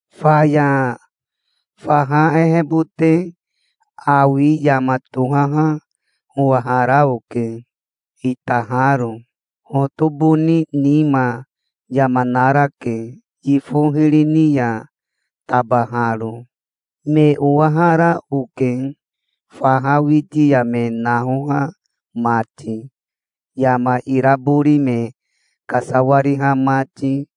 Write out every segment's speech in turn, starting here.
Faya faha ehebote awi yama tohaha owahara oke, itaharo. Hotoboni nima yama narake, yifo hiri ni ya tabaharo. Me owahara oke, faha witi ya me nahoha mati, yama irabori me kasawariha mati,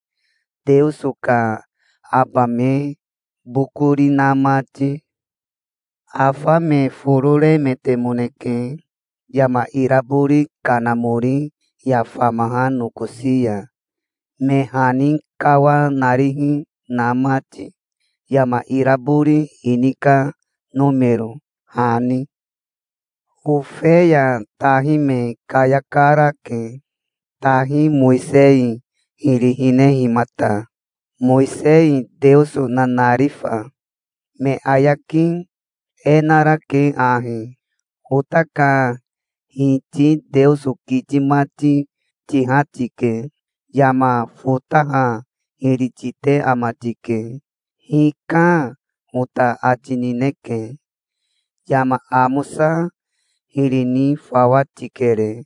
Teoso ka aba me bokori na mati. Afa me foro remetemoneke yama irabori kanamori ya famaha nokosi ya, me hani kawanarihi na mati, yama irabori ini ka nomero hani. Ofeya tahi me kayakarake, tahi Mowisei hiri hinehimata, Mowisei Teoso nanarifa. Me ayaki e narake ahi: "Ota ka Hiti Teoso kiti mati tiha tike. Yama fotaha hiri tite ama tike. 'Hika', ota ati nineke. Yama amosa hiri ni fawa tikere.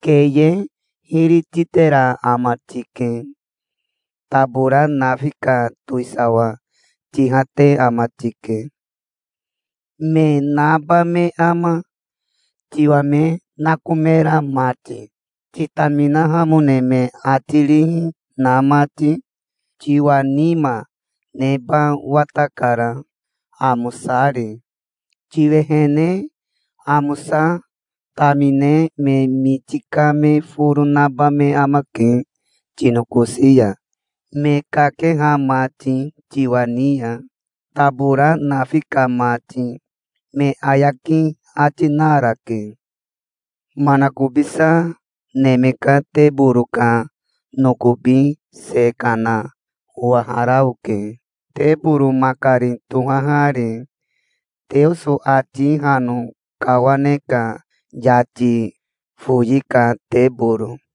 Keye hiri titera ama tike. Tabora nafi ka towisawa tihate ama tike. Me naba me ama, tiwa me nakomera mati, titaminahamone me ati rihi na mati? Tiwa nima neba watakara, amosari. Tiwehene amosa tamine me miti ka me foro naba me amake tinokosi ya, me kakeha mati tiwa ni ya, tabora nafi ka mati", me ayaki ati narake. Manakobisa neme ka teboro ka nokobi se kana owahara oke, teboro makari tohahari, Teoso ati hano kawane ka yati foyi ka teboro.